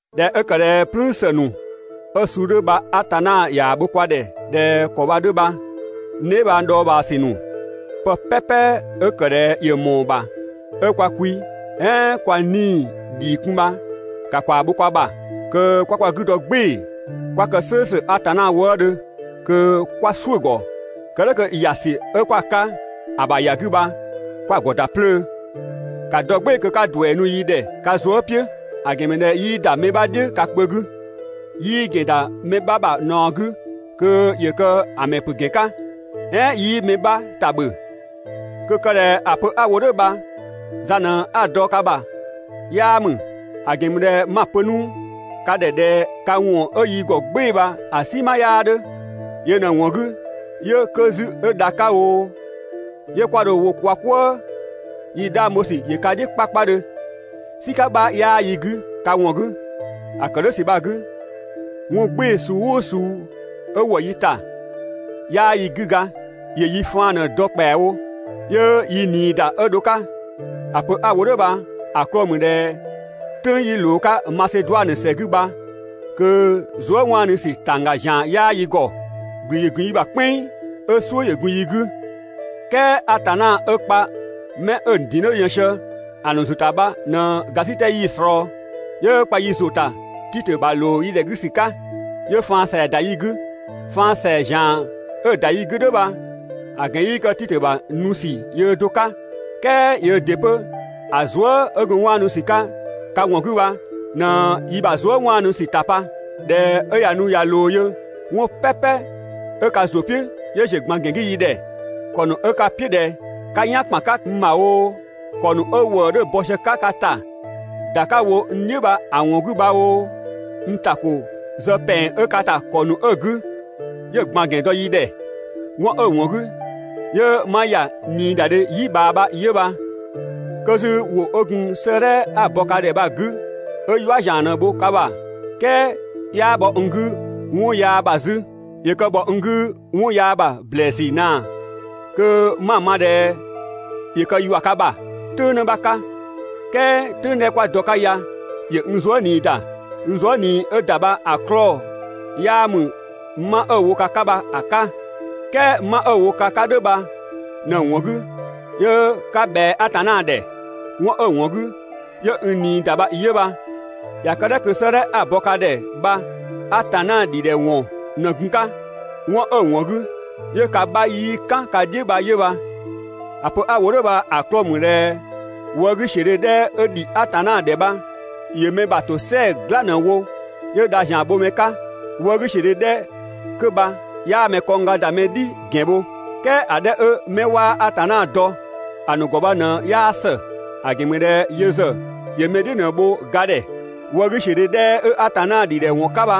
꞊Dhɛ 'ö ‑kë ꞊dhɛ "plüün ‑së ‑nu 'ö‑ suu 'dhö bha Atanna ꞊yaa‑ bho kwa ‑dhɛ ꞊dhɛ ‑kɔ bha‑ 'dhö bha, n dheebhang dhɔɔbhaa ‑sü ‑nu, pë 'pɛpɛ 'ö ‑kë ꞊dhɛ ‑yö ‑mɔɔ ‑bha 'ö kwa kwi "ɛɛn kwa 'nii‑ ‑dhii kun bha ‑ka ‑kwaa bho kwa ‑bha, kö 'kwa kwa 'gü dɔ "gbɩɩ‑ 'kwa kë "slʋ̈ʋ̈slʋ̈ Atanna wëëdhö, kö 'kwa "suʋ̈‑ ‑gɔ kë "dhʋ̈ kö ‑ya ‑sü 'ö 'kwa‑ 'ka ‑a ‑bha ‑ya 'gü bha 'kwa‑ ‑gɔ ‑da 'plöö. ‑Ka dɔ "gbɩɩ‑ kö 'ka ‑duɛ nu yi ‑dhɛ ka zuë" "piʋ̈, ‑a ‑gɛn ‑mü ꞊dhɛ 'yii ‑da mɛ 'bha "dhiʋ̈ ka kpö 'gü, 'yii ‑gɛn ‑da mɛ 'bha ‑bha ꞊naɔ 'gü kö ‑yö kë‑ ‑mɛ ‑pö ‑gɛn 'ka, "ɛɛn 'yii mɛ 'bha ‑ta ‑bhö. Kö‑ kë ꞊dhɛ ‑a pö 'a‑ wo "dhʋ̈ bha za ꞊në 'a‑ dɔ‑ 'ka ka ‑bha 'yaa ‑mü. ‑A ‑gɛn ‑mü ꞊dhɛ 'ma‑ pö 'nu ka ‑dhɛ ꞊dhɛ ka ‑wɔn 'ö yi ‑gɔ "gbɩɩ‑ bha‑ "sima 'yaa 'dhö. Yö ꞊në‑ ‑wɔn 'gü 'yö 'kö 'zü 'ö ga 'ka oo, 'ɛɛn 'ö dha 'ka oo, 'yö 'kwa dho‑ wo kwa "kwëë. Yi 'dhang bho ‑sü ‑yö ka "dhiʋ̈ 'kpakpadhö, "sika 'bha 'yaa yi 'gü ka ‑wɔn 'gü. ‑A ‑kë "dhʋ̈ ‑sü bha‑ 'gü, 'wɔn "gbɩɩ‑ suu "ʋʋ suu 'ö ‑wɔ yi ‑ta, 'yaa yi 'gü ga, ‑yö yi faan ꞊në‑ dɔ ‑kpɛawo, 'yö yi ꞊nii ‑da 'ö dho‑ 'ka. ‑A pö 'a‑ wo "dhʋ̈ bha‑ 'klɔɔ‑ ‑mü ꞊dhɛ "tʋ̈ng 'yi ꞊loo‑ 'ka Maseduanö ‑sɛ 'gü bha kö zuëwaanusü ‑tangga ‑zian 'yaa yi ‑gɔ. ‑Gblü ‑yö ‑gun yi ‑bha "kpɛnng, 'ö "suʋ̈ ‑yö gun yi 'gü. "Kɛɛ Atanna 'ö kpa 'mɛ 'ö‑ ‑nu ‑din 'dhö yën sië‑ ‑nu ‑zʋ ‑ta bha ꞊në ‑gasitɛ 'yii‑ ꞊slɔɔ, 'yö kpa yi ‑zʋ ‑ta Titö ‑bha ‑loo yi ‑dhɛ 'gü ‑sü 'ka. 'Yö faan ‑sɛa ‑da yi 'gü. Faan ‑sɛa ‑zian 'ö ‑da yi 'gü "dhʋ̈ bha‑ ‑gɛn 'yii kë Titö ‑bha nu ‑sü yöö do‑ 'ka, "kɛɛ yöö ‑dɩ 'pö‑ zuë" 'ö gun 'waannu ‑sü 'ka ka ‑wɔn 'gü bha ꞊në yi ‑bha zuë" 'waanu ‑sü ‑ta pa. ꞊Dhɛ 'ö ꞊ya nu ꞊ya ꞊loo yö, 'wɔn "pɛpɛ 'ö ka ‑zʋ "piʋ̈ 'yö ‑ziö ꞊gban ‑gɛn 'gü yi ‑dhɛ. ‑Kɔ ‑nu 'ö ka "piʋ̈ ꞊dhɛ 'ka "yan ‑kpan 'ka n ‑bha oo, ‑kɔ ‑nu 'ö ‑wëë 'dhö bɔ sië‑ 'ka ka ‑ta ‑da 'ka‑ wo n "dhiʋ̈ bha‑ ‑wɔn 'gü bha oo, n ‑ta ‑ko zë ‑pɛng 'ö ka ‑ta ‑kɔ ‑nu 'ö‑ 'gü, 'yö‑ ꞊gban ‑gɛn ‑dɔ yi ‑dhɛ. 'Wɔn 'ö‑ ‑wɔn 'gü 'yö 'ma ‑ya ꞊niidadhe "yi ꞊bhaa bha 'yö bha. 'Kö 'zü ‑wʋ 'ö gun 'sëëdhɛ 'a‑ bɔ ka ‑dhɛ bha‑ 'gü 'ö "yua ‑zian ꞊në‑ wo ka ‑bha, "kɛɛ 'yaa bhɔ n 'gü 'wɔnyaa ‑bha 'zü. ‑Yö kë ‑bhɔ n 'gü 'wɔn yaa ‑bha ‑blɛɛsü ꞊naa kö 'ma‑ ma ꞊dhɛ ‑yö kë ‑yua ka ‑bha "tʋ̈ng ꞊në 'bha 'ka. "Kɛɛ "tʋ̈ng 'dhɛ 'kwa dɔ‑ 'ka ya ‑yö n zuë" ꞊nii ‑da. N zuë" ꞊nii 'ö‑ ‑da bha‑ 'klɔɔ‑ 'yaa ‑mü 'ma 'ö‑ wo ka ‑bha bha‑ 'ka. "Kɛɛ 'ma 'ö‑ wo ka ‑bha "dhʋ̈ bha ꞊në‑ ‑wɔn 'gü 'yö 'ka ‑bhɛa Atanna ‑dhɛ. 'Wɔn 'ö‑ ‑wɔn 'gü 'yö n ꞊nii ‑da bha 'yö bha. ꞊Ya kë "dhʋ̈ kö 'sëëdhɛ 'a‑ bɔ ka ‑dhɛ bha Atanna ‑dhidhɛ ‑wɔn ꞊në gun‑ 'ka, 'wɔn 'ö‑ ‑wɔn 'gü 'yö ka 'bha 'yii "kan ka "dhiʋ̈ bha 'yö bha. ‑A pö 'a‑ wo "dhʋ̈ bha‑ 'klɔɔ‑ ‑mü ꞊dhɛ wëëgüsiödhe 'dhɛ 'ö ‑dhi Atanna ‑dhɛ bha ‑yö mɛ ‑bha ‑tosɛa "gla ꞊në‑ wo 'yö dha ‑zian bho mɛ 'ka. Wëëgüsiödhe 'dhɛ 'kö bha 'yaa mɛ kɔngga ‑da mɛ "dhi ‑gɛn bho. "Kɛɛ ‑a 'dhɛ 'ö 'mɛ 'waa Atanna dɔ ‑a ‑nu ‑gɔ bha ꞊në 'yaa ‑së. ‑A ‑gɛn ‑mü ꞊dhɛ yö ‑zë ‑yö mɛ "dhiʋ̈ ꞊në‑ bho ga ‑dhɛ. Wëëgüsiödhe 'dhɛ 'ö Atanna ‑dhidhɛwɔn 'ka bha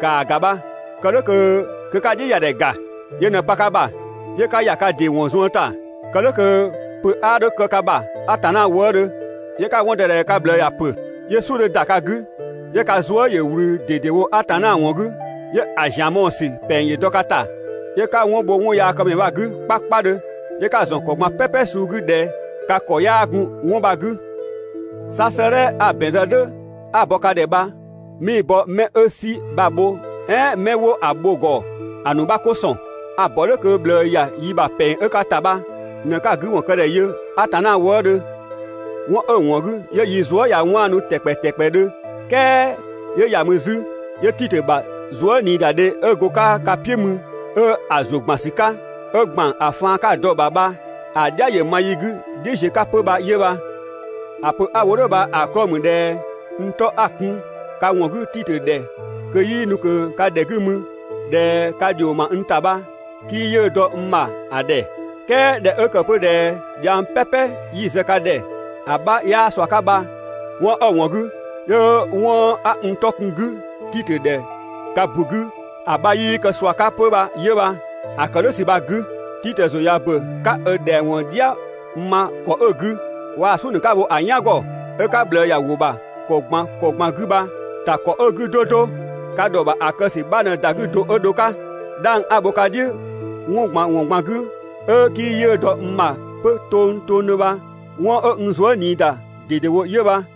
‑kaa ‑ga bha, kö 'ka‑ "dhiʋ̈ ‑ya ‑dhɛ ‑ga. Yö ꞊në pa ka ‑bha 'yö 'ka ‑ya ka ‑dɩ ‑wɔn zuën ‑ta, kë "dhʋ̈ kö pö 'a 'dho kë ka ‑bha Atanna wëëdhö, 'yö 'ka‑ 'wɔn dɔ ꞊dhɛ ka ꞊bhlë ꞊ya ‑pö, 'yö "suʋ̈ 'dhö ‑da ka 'gü, 'yö ka zuë" ‑yö ꞊wlü ꞊dedewo Atanna ‑wɔn 'gü, 'yö‑ ‑zian mɔɔ‑ ‑sü ‑pɛng dɔ ka ‑ta, 'yö 'ka 'wɔn bho 'wɔnyaakëmɛ bha‑ 'gü 'kpakpadhö, 'yö 'ka‑ ‑zɔn ‑kɔ ꞊gban "pɛpɛ suu 'gü ꞊dhɛ ka ‑kɔ 'yaa gun 'wɔn bha‑ 'gü. 'Sa 'sëëdhɛ 'a‑ ‑bɛn zë "dhʋ̈ 'a‑ bɔ ka ‑dhɛ bha 'mii‑ bɔ 'mɛ 'ö "si bha‑ bho, "ɛɛn 'mɛ 'wo‑ bho‑ ‑gɔ ‑a ‑nu 'bha 'ko ‑sɔn. A‑ ‑bɔ "dhʋ̈ kö ꞊bhlë ‑ya yi ‑bha ‑pɛng 'ö ka ‑ta bha ꞊në 'ka‑ 'gü ‑wɔn kë ‑dhɛ yö Atanna wëëdhö. 'Wɔn 'ö‑ ‑wɔn 'gü 'yö yi zuë" ꞊ya 'waannu ‑tɛkpɛ ‑tɛkpɛdhö, "kɛɛ 'yö ‑ya mü 'zü, 'yö Titö ‑bhaa zuëniidadhe 'ö go‑ 'ka ka "piʋ̈ mü 'ö‑ ‑zʋ ‑gban ‑sü 'ka, 'ö ‑gban ‑a faan 'ka‑ dɔ‑ ‑bha bha‑ "dhia ‑yö ma yi 'gü "dhiʋ̈ ziö 'ka 'pö bha 'yö bha. ‑A pö 'a‑ wo "dhʋ̈ bha‑ 'klɔɔ‑ ‑mü ꞊dhɛ n 'tɔ 'a‑ kun ka ‑wɔn 'gü Titö ‑dhɛ ꞊kö 'yii nu ꞊kö ka ‑dhɛ 'gü mü, (꞊dhɛ ka ‑dhio ‑ma n ‑ta) bha, 'kii 'yiʋ̈‑ dɔ n ‑bha ‑a ‑dhɛ. "Kɛɛ ꞊dhɛ 'ö ‑kë 'pö ꞊dhɛ dhiang "pɛpɛ 'yi‑ zë ka ꞊dhɛ ‑a 'bha 'yaa ꞊sua 'ka bha, 'wɔn 'ö‑ ‑wɔn 'gü 'yö 'wɔn 'a n 'tɔ kun‑ 'gü Titö ‑dhɛ ka ‑bu 'gü ‑a 'bha 'yii kë ꞊sua 'ka 'pö bha 'yö bha. ‑A ‑kë "dhʋ̈ ‑sü bha‑ 'gü, Titö ‑zʋ ꞊ya ‑bö 'ka ö ‑dhɛang ‑wɔn "dhia ma ‑kɔ 'ö‑ 'gü, waa‑ "suʋ̈ ‑nu 'ka‑ wo‑ "yan ‑gɔ 'ö 'ka ꞊bhlë ‑ya ‑wʋ ‑bha ‑kɔ ꞊gban ‑kɔ ꞊gban 'gü bha‑ ‑ta ‑kɔ 'ö‑ 'gü 'do 'do, ka ‑dhɔ ‑bha ‑a kë ‑sü 'bha ꞊në ‑da 'gü do 'ö dho‑ 'ka. 'Dhang 'a‑ bho ka "dhiʋ̈ 'wɔn ꞊gban ‑wɔn ꞊gban 'gü 'ö 'kii 'yiʋ̈‑ dɔ n bha 'pö tongtongdhö bha 'wɔn 'ö n zuë" ꞊nii ‑da ꞊dedewo 'yö bha.